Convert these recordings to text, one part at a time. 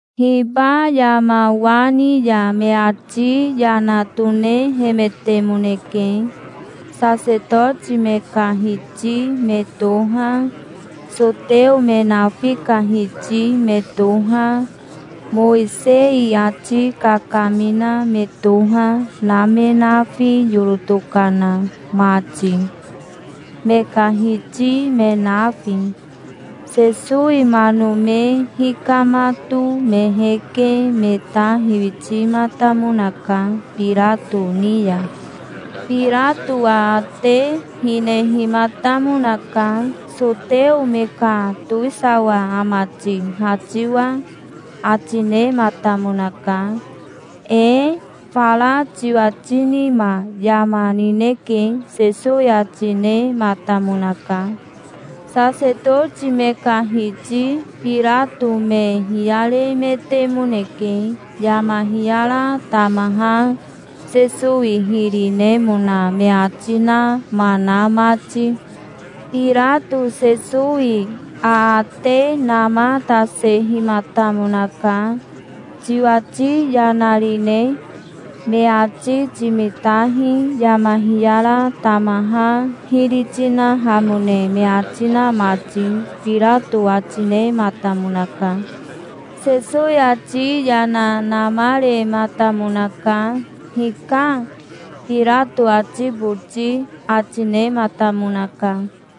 Hiba yama wa ni ya me ati yana tonehemetemoneke, Sasetoti me ka hiti me toha, soteo me nafi ka hiti me toha, Mowisei ati kakamina me toha, na me nafi yoro tokana mati, me ka hiti me nafi. Sesowi mano me hikamato me heke me ta hiwitimatamonaka Birato ni ya. Birato aate hinehimatamonaka. "Soteo me ka towisawa ama ti, ha tiwa?" ati nematamonaka. "Ee, fara tiwati nima yama nineke", Sesowi ati nematamonaka. Sasetoti me ka hiti Birato me hiyaremetemoneke, yama hiyara tamaha Sesowi hiri nemona me ati nama na mati. Birato Sesowi aate namatasehimatamonaka. "Tiwati yana rine? Me ati timitahi, yama hiyara tamaha hiri tinahamone me ati na mati", Birato ati nematamonaka. Sesowi ati yana namarematamonaka. "Hika", Birato ati boti ati nematamonaka.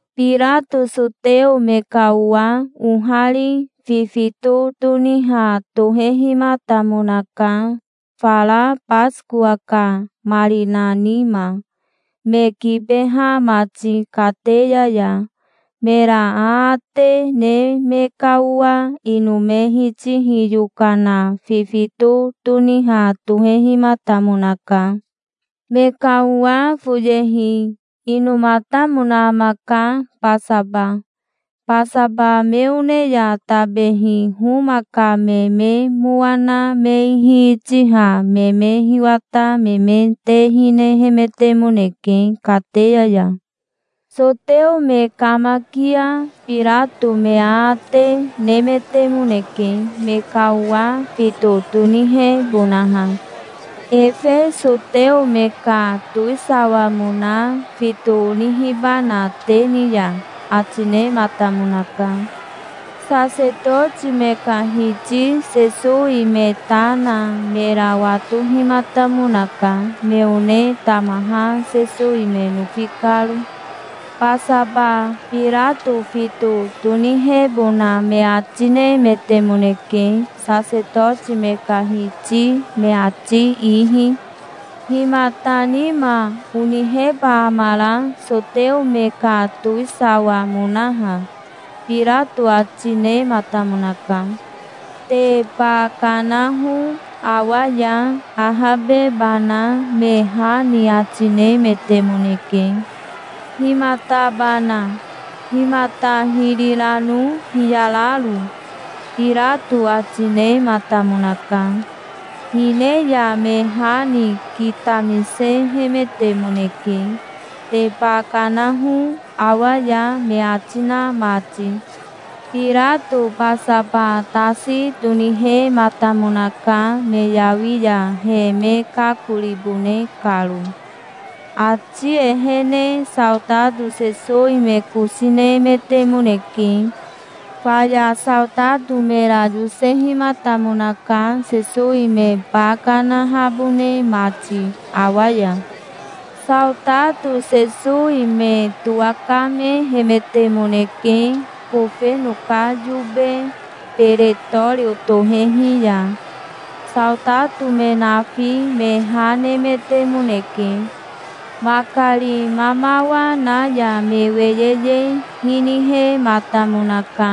Birato soteo me ka owa ohari fifito toniha tohehimatamonaka, fara Basikowa ka marina nima, me kibeha mati kateya ya. Mera aate ne me ka owa ino me hitihi yokana fifito toniha tohehimatamonaka. Me ka owa foyehi inomatamona amaka, Basaba. Basaba me one ya tabehi Homa ka me me mowa na me ihi itiha me me hiwata me me te hinehemetemoneke kateya ya. Soteo me kamakia Birato me aate nemetemoneke, me ka owa fito tonihebonaha. "Efe soteo me ka towisawamona fito onihibana te ni ya?" ati nematamonaka. Sasetoti me ka hiti Sesowi me ta na mera watohimatamonaka, me one tamaha Sesowi me nofi karo. Basaba Birato fito tonihebona me ati nemetemoneke, sasetoti me ka hiti me ati ihi. "Himata nima oniheba amara, soteo me ka towisawamonaha?" Birato ati nematamonaka. "Te ba kanaho awa ya, ahabebana", me ha ni ati nemetemoneke. "Himatabana? Himata hiri rano hiyararo?" Birato ati nematamonaka. Hine ya me ha ni kitamisehemetemoneke, "Te ba kanaho awa ya", me ati na mati. Birato Basaba tasi tonihematamonaka, me yawi ya he me kakoribone karo. Ati ehene saotato Sesowi me kosi nemetemoneke. Faya saotato mera yosehimatamonaka, Sesowi me ba kanahabone mati awa ya. Saotato Sesowi me towakamehemetemoneke kofeno ka yobe Beretorio tohehi ya. Saotato me nafi me ha nemetemoneke. Makari mamawa na ya me weyeye hinihematamonaka.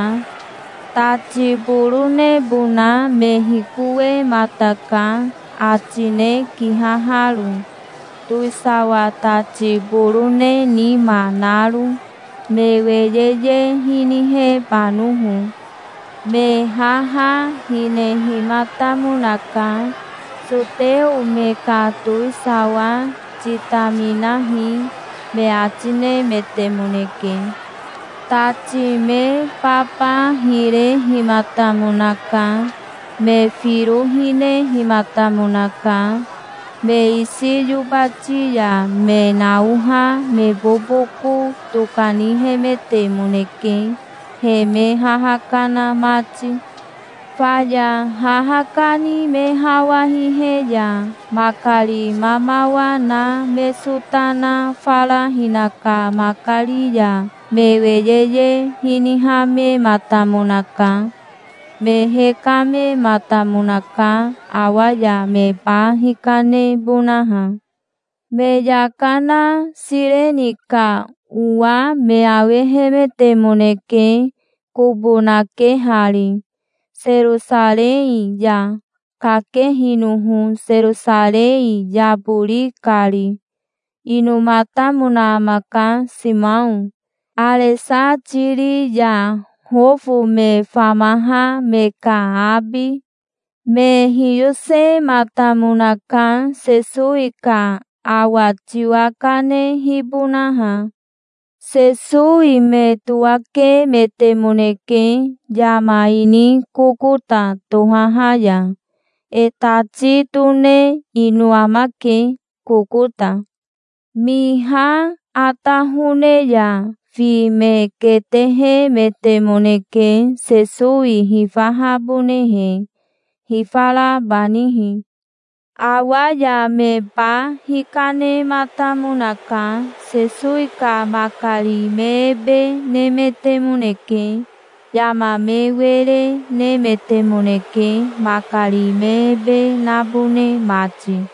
Tati boronebona me hikowemataka, atine kihaharo, towisawa tati borone nima naro, me weyeye hinihebanoho. Me haha hinehimatamonaka. "Soteo me ka towisawa, titaminahi", me ati nemetemoneke. Tati me baba hirehimatamonaka. Me firo hinehimatamonaka. Me isi yobati ya me naoha me boboko tokanihemetemoneke, he me haha kana mati. Faya haha kani me hawa hihe ya makari mamawa na me sota na fara hinaka makari ya me weyeye hinihamematamonaka. Me hekamematamonaka, awa ya me ba hikanebonaha. Me yaka na Sireni ka owa me awehemetemoneke, kobo nakehari, Serosarei ya, kakehinoho Serosarei yabori kari. Inomatamona amaka, Simao, Aresatiri ya Hofo me famaha me ka abi. Me hiyosematamonaka, Sesowi ka awa tiwa kanehibonaha. Sesowi me towakemetemoneke yama ini Kokota tohaha ya. E tati tone ino amake, Kokota. Miha atahone ya fi me ketehemetemoneke, Sesowi hifahabonehe, hifarabanihi. Awa ya me ba hikanematamonaka. Sesowi ka makari me ebe nemetemoneke. Yama me were nemetemoneke, makari me ebe nabone mati.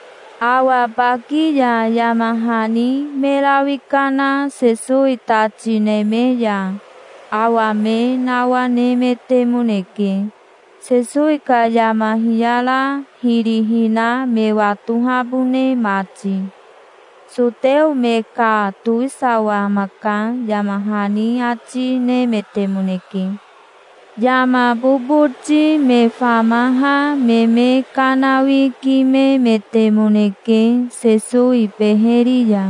Awa baki ya yama hani me rawi kana Sesowi tati neme ya awa me nawanemetemoneke, Sesowi ka yama hiyara hiri hina me watohabone mati. "Soteo me ka towisawa amaka", yama hani ati nemetemoneke. Yama boboti me famaha me me kanawikimemetemoneke Sesowi beheri ya.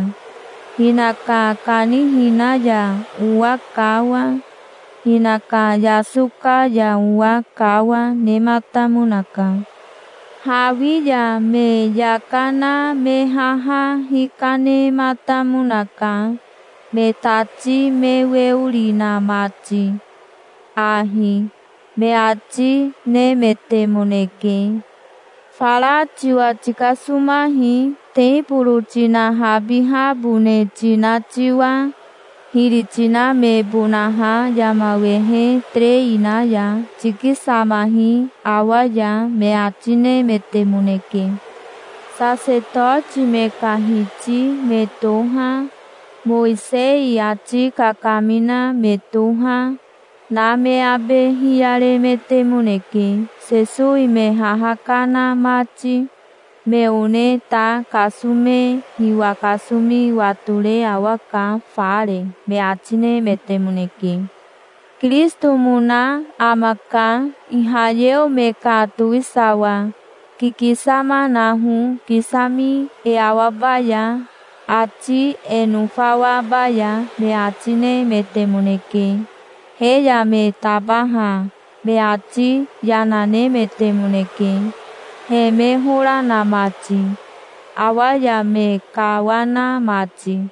Hinaka kanihina ya owa kawa, hinaka yasoka ya owa kawa, nematamonaka. Hawi ya me yaka na me haha hikanematamonaka, me tati me weori na mati. "Ahi", me ati nemetemoneke. "Fara tiwa tikasomahi, teboro tinahabihabone tina tiwa, hiri tinamebonaha yama wehe terei na ya. Tikisamahi awa ya", me ati nemetemoneke. Sasetoti me ka hiti me toha, Mowisei ati kakamina me toha, na me abe hiyaremetemoneke, Sesowi me haha kana mati. "Me one ta kasome hiwa kasomi watore awaka fare", me ati nemetemoneke. "Kirisitomona amaka, Ihayeo me ka towisawa. Kikisama naho, kisami e awabaya, ati e nofawabaya", me ati nemetemoneke. He ya me tabaha me ati yana, nemetemoneke, he me hora na mati, awa ya me kawana mati.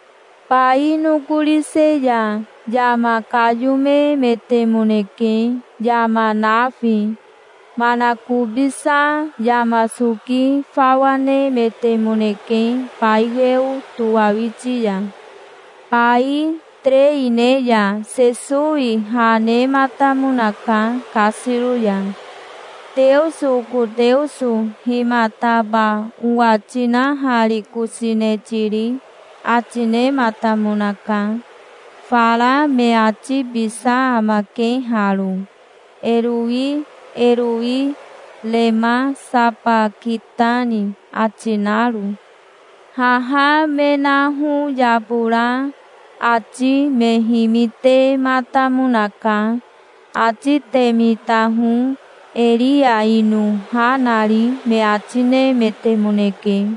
Bai nokorise ya yama kayomemetemoneke, yama nafi. Manakobisa yama soki fawa nemetemoneke bai weo towawiti ya. Bai terei ne ya Sesowi ha nematamonaka kasiro ya. "Teoso, oko Teoso, himataba owa tinaharikosine tiri?", ati nematamonaka. Fara me atibisa amake haro: "Erowi, erowi, rema sabakitani?" ati naro. Haha me naho yabora ati me himitematamonaka. "Ati te mitaho, Eria ino ha nari", me ati nemetemoneke.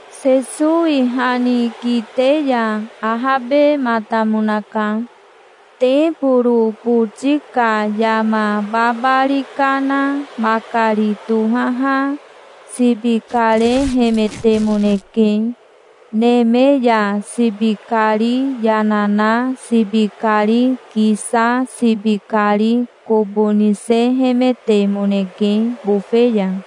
Sesowi ha ni kite ya ahabematamonaka. Teboro boti ka yama babari kana makari tohaha sibi karehemetemoneke. Neme ya sibi kari yana na sibi kari kisa sibi kari kobo nisehemetemoneke bofe ya.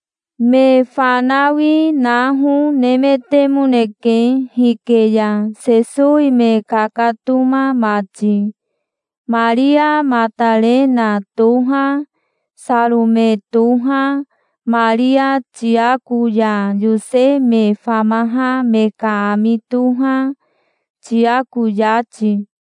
Me fanawi naho nemetemoneke hike ya, Sesowi me kakatoma mati. Maria Matarena toha, Sarome toha, Maria Tiako ya Yose me famaha me ka ami toha, Tiako yati.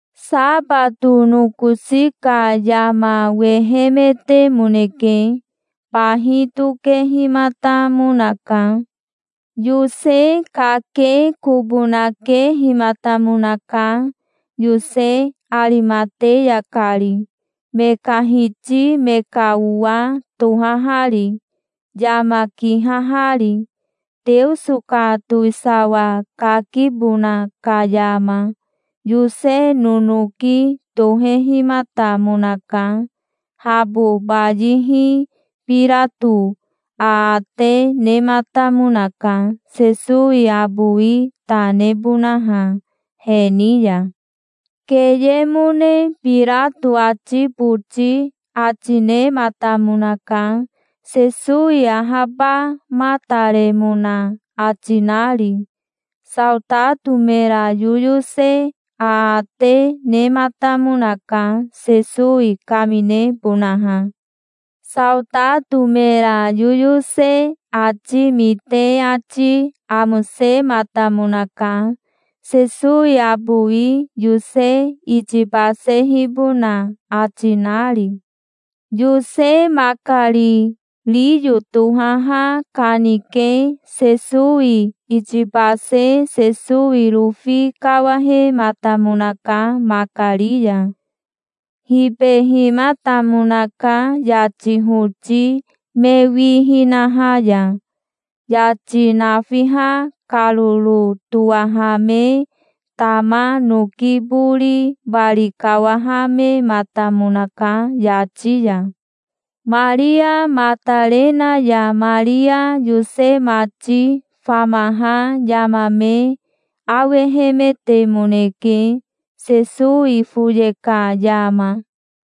Sabato nokosi ka yama wehemetemoneke. Bahi tokehimatamonaka. Yose kake kobo nakehimatamonaka, Yose Arimateya kari, me ka hiti me ka owa tohahari, yama kihahari. Teoso ka towisawa kakibona ka yama Yose nonoki tohehimatamonaka. Habo bayihi Birato aate nematamonaka, Sesowi abowi ta nebonaha he ni ya. Keyemone Birato ati boti ati nematamonaka, Sesowi ahabamataremona ati nari. Saotato mera yoyose aate nematamonaka, Sesowi kaminebonaha. Saotato mera yoyose ati mite ati amosematamonaka, Sesowi abowi Yose itibasehibona ati nari. Yose makari riyo tohaha kanike Sesowi itibase Sesowi rofi kawahematamonaka, makari ya. Hibehimatamonaka yati hoti me wi hinaha ya. Yati nafiha karoro towahame tama noki bori bari kawahamematamonaka yati ya. Maria Matarena ya Maria Yose mati famaha yama me awehemetemoneke, Sesowi foye ka yama.